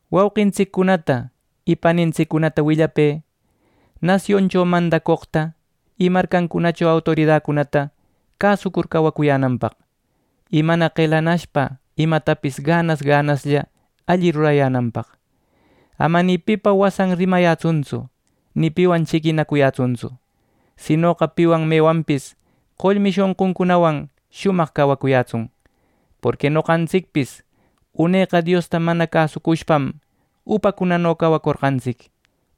Wauqintsiccunata y panintsiccunata willapë nasioncho mandacoqta y marcancunacho autoridacunata cäsucur cawacuyänanpaq, y mana qelanashpa imatapis ganas ganaslla alli rurayänanpaq. Ama ni pipa wasan rimayätsuntsu, ni piwan chiquinacuyätsuntsu; sinoqa piwan mewanpis qollmi shonquncunawan shumaq cawayätsun. Porqui noqantsicpis uneqa Diosta mana cäsucushpam upacunano cawacorqantsic,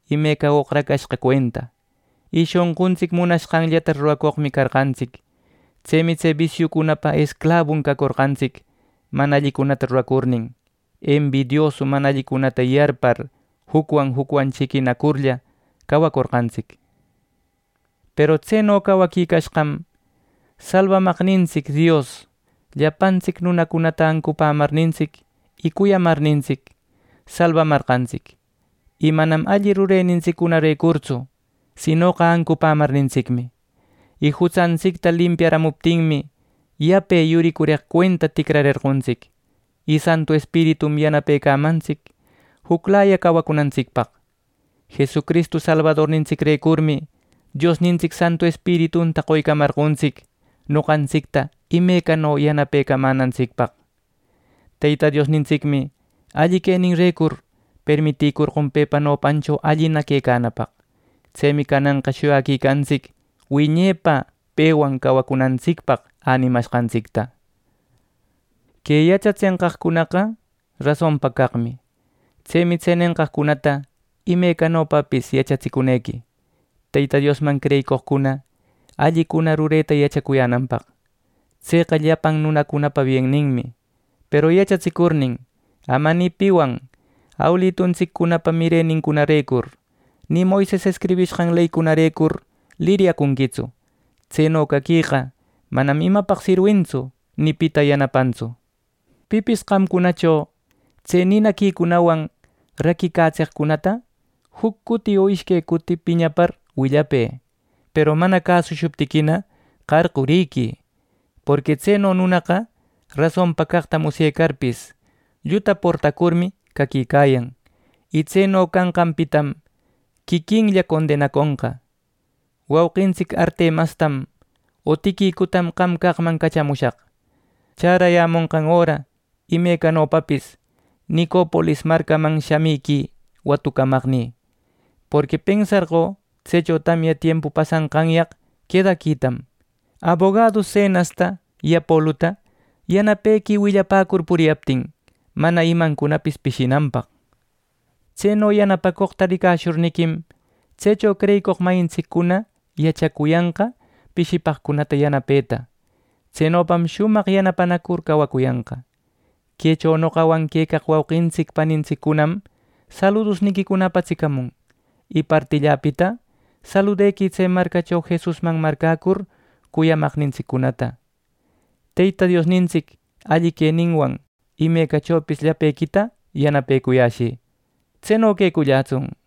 imeca oqracashqa cuenta. Y shonquntsic munashqanllata ruracoqmi carqantsic. Tsemi tse bisiucunapa esclabun cacorqantsic mana allicunata ruracurnin, embidiosu mana allicunata yarpar jucwan jucwan chiquinacurlla cawacorqantsic. Peru tseno cawaquicashqam Salbamaqnintsic Dios, llapantsic nunacunata ancupämarnintsic y cuyamarnintsic, salbamarqantsic; y manam alli rurenintsiccunarecurtsu, sinoqa ancupämarnintsicmi. Y jutsantsicta limpiaramuptinmi, yape yuricureq cuenta ticrarerqontsic, y Santu Espiritum yanapecamantsic juclaya cawacunantsicpaq. Jesucristu Salbadornintsicrecurmi Diosnintsic Santu Espiritunta qoycamarqontsic noqantsicta imecano yanapecamänantsicpaq. Teyta Diosnintsicmi alli queninrecur permitïcorqon pepa nopancho allina quecanapaq. Tsemi cananqa shuyaquicantsic wiñepa pewan cawacunantsicpaq änimashqantsicta. Que yachatsenqaqcunaqa rasonpa caqmi. Tsemi tse nenqaqcunata imecanopapis yachatsicunequi Teyta Diosman creyicoqcuna allicuna rureta yachacuyänanpaq. Tseqa llapan nunacunapa bienninmi. Peru yachatsicurnin ama ni piwan awiluntsiccunapa mirenincunarecur, ni Moises escribishqan leynincunarecur liryacunquitsu. Tseno caqueqa manam imapaq sirwintsu, ni pita yanapantsu. Pipis qamcunacho tse ninaquicunawan raquicatseqcunata juc cuti o ishque cuti piñapar willapë, peru mana cäsushuptiquina qarquriquï. Porqui tseno nunaqa rasonpa caqta musyecarpis, lluta portacurmi caquicayan. Y tseno canqanpitam quiquillan condenaconqa. Wauqintsic Artemastam o Tiquicutam qam caqman cachamushaq. Chärayämonqan öra imecanopapis Nicopolis marcaman shamïquï watucamaqnï; porqui pensarqö tsecho tamya tiempu pasanqanyaq quedaquitam. Abogadu Zenasta y Apoluta yanapequï, willapäcur, puriyaptin mana imancunapis pishinanpaq. Tseno yanapacoqta ricayäshurniquim, tsecho creyicoq mayintsiccuna yachacuyanqa pishipaqcunata yanapeta. Tsenopam shumaq yanapanacur cawacuyanqa. Quecho noqawan quecaq wauqintsic panintsiccunam saludusniquicuna apatsicamun. Y partilläpita saludequï tse marcacho Jesusman marcäcur cuyamaqnintsiccunata. Teyta Diosnintsic alli queninwan imecachopis llapequita yanapeculläyäshï. Tseno quecullätsun.